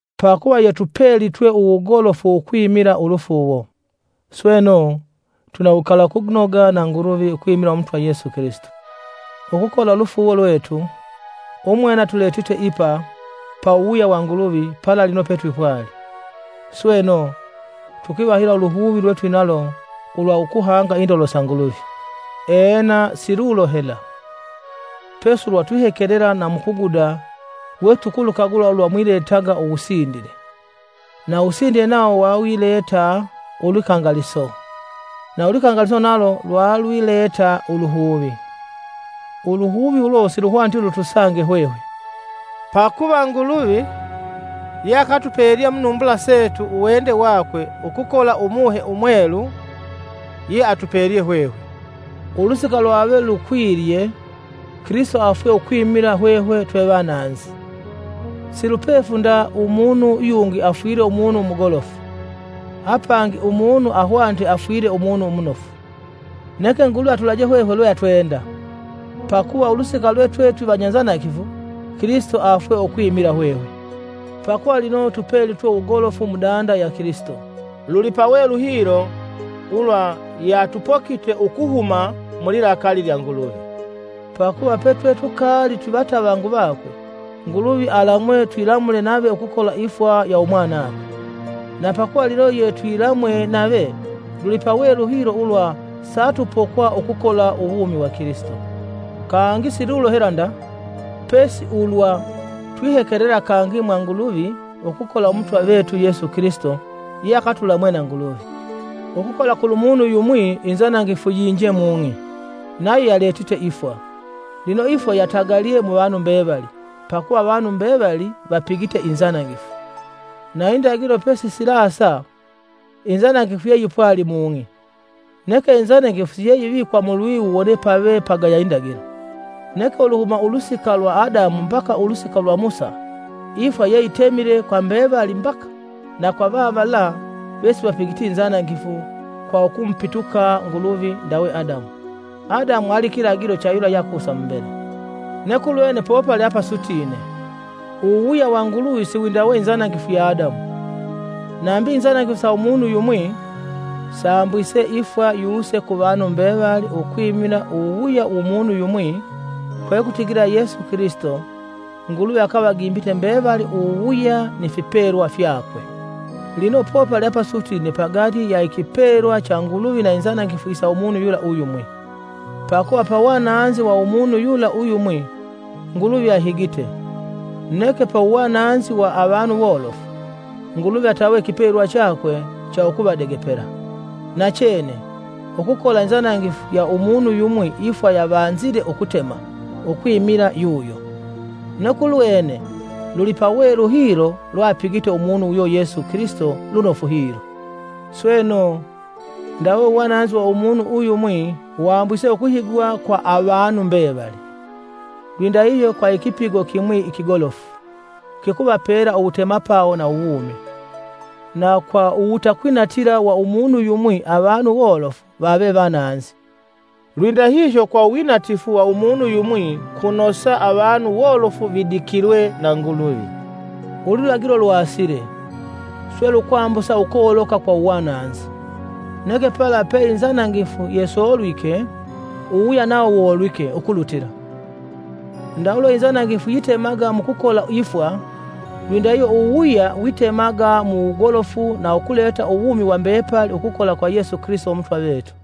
Pakuva yetupelitwe uwugolofu ukwimila ulufuuwo, sweno, twina uwikalakunoga na Nguluvi ukwimila Umutwa Yesu Kilisito. Ukukola ulufuuwo lwetu, umwene atuletite ipa pa uwuwuya wa Nguluvi pala lino petwipwali. Sweno, tukwivahila uluhuvi lwetwinalo ulwa ukuhanga indolo sa Nguluvi! Ena, silulo hela, pesi ulwa twihekelela na mukuguda we tulukukagula ulwa mwiletaga uwusindile, na uwusindile nawo yayileta ulwikangaliso na ulwikangaliso nalo lwalwileta uluhuvi. Uluhuvi ulo siluhwaniti lutusange hwehwe, pakuva Nguluvi yeakatupelye munumbula setu uwende wakwe ukukola Umuhe Umwelu yeatupelye hwehwe. Ulusika lwave lukwilye, Kilisito afwe ukwimila hwehwe twevananzi! Silupefu nda umunu yungi afwile umunu umugolofu; apangi umunu ahwanite afwile umunu umunofu. Neke Nguluvi atulaje hwehwe lwe atwenda. Pakuva ulusika lwe twe twivanyanzanangifu, Kilisito afwe ukwimila hwehwe. Pakuva lino tupelitwe uwugolofu mu danda ya Kilisito, lulipawelu hilo ulwa yeatupokite ukuhuma mulilakali lya Nguluvi! Pakuva petwetukaali twivatavangu vakwe, Nguluvi alamwe twilamule nave ukukola ifwa ya umwanakwe. Na pakuva lino yetwilamwe nave, lulipawelu hilo ulwa satupokwa ukukola uwumi wa Kilisito. Kangi si lulo hela nda, pesi ulwa twihekelela kangi mwa Nguluvi ukukola Umutwa vetu Yesu Kilisito yeakatulamwe na Nguluvi. Ukukola kulumunu yumwi inzanangifu yiinje mung'i, nayo yaletite ifwa. Lino ifwa yatagalye muvanu mbevali, pakuva avanu mbevali vapigite inzanangifu. Na indagilo pesisilasa, inzanangifu yeyipwali mung'i, neke inzanangifu siyeyivikwa mulwiwu wone pave pagaya indagilo. Neke uluhuma ulusika lwa Adamu mbaka ulusika lwa Musa, ifwa yeyitemile kwa mbevali mbaka, na kwa vavala vesivapigiti inzanangifu kwa ukumupituka Nguluvi ndawe Adamu. Adamu ali kilagilo cha yula yeakusa mumbele. Neke ulwene popali apasutine; uwuwuya wa Nguluvi siwindawe inzanangifu ya Adamu. Nambi inzanangifu sa umunu yumwi sambwise ifwa yuse ku vanu mbevali ukwimila uwuwuya wu munu yumwi, kwekutigila Yesu Kilisito Nguluvi akavagimbite mbevali uwuwuya ni fipelwa fyakwe. Lino popali apasutine pagati ya ikipelwa cha Nguluvi na inzanangifu isa umunu yula uyumwi. Pakuva pawananzi wa umunu yula uyumwi, Nguluvi ahigite, neke pauwananzi wa avanu wolofu, Nguluvi atawe ikipelwa chakwe cha ukuvadegepela. Nachene, ukukola inzanangifu ya umunu yumwi ifwa yavanzile ukutema, ukwimila yu yo, neke ulwene lulipawelu hilo lweapigite umunu uyo Yesu Kilisito lunofu hilo. Sweno, ndawe uwananzi wa umunu uyumwi wambwise ukuhigwa kwa avanu mbevali, lwindahihyo kwa ikipigo kimwi ikigolofu kikuvapela uwutemapawo na uwumi. Na kwa uwutakwinatila wa umunu yumwi avanu wolofu vave vananzi, lwindahihyo kwa uwinatifu wa umunu yumwi kunosa avanu wolofu vidikilwe na Nguluvi. Ululagilo lwasile, swe lukwambusa ukoloka kwa uwananzi, neke pala peinzanangifu yesolwike, uwuwuya nawo wolwike, ukulutila. Ndawe lwe inzanangifu yitemaga mukukola ifwa, lwindahihyo uwuwuya witemaga mu wugolofu na ukuleta uwumi wa mbepali ukukola kwa Yesu Kilisito Umutwa vetu.